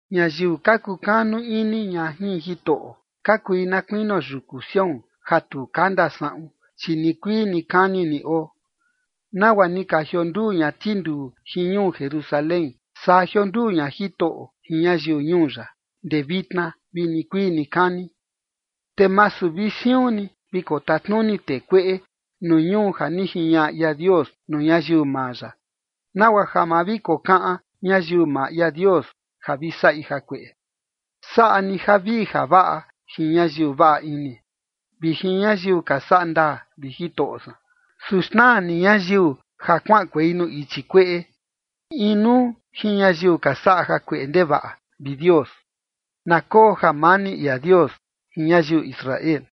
Ñayiu ka kukanu ini ña jin Jitoꞌo, ka kui na kuinio yuku Sión, ja tu kanda saꞌun, chi nikuii nikani ni oo. Nagua ni ka jionduu ña tinduu jin ñuu Jerusalén, saa jionduu ña Jitoꞌo jin ñayiu ñuu ya, ndee vitna vi nikuii nikani. Te masu vi siun ni vi kotatnuni tee kueꞌe, nuu ñuu ja ni jiñaꞌa ia Dios nuu ñayiu maa ya, nagua ja ma vi kokaꞌan ñayiu maa ia Dios ja vi saꞌi jakueꞌe. Saꞌa ni javii javaꞌa jin ñayiu vaꞌa ini, vi jin ñayiu ka saꞌa ndaa, vi Jitoꞌo san. Su xnaa ni ñayiu ja kuaꞌankuei nuu ichi kueꞌe, inuu jin ñayiu ka saꞌa jakueꞌe ndevaꞌa, vi Dios. ¡Na koo jamani ia Dios jin ñayiu Israel!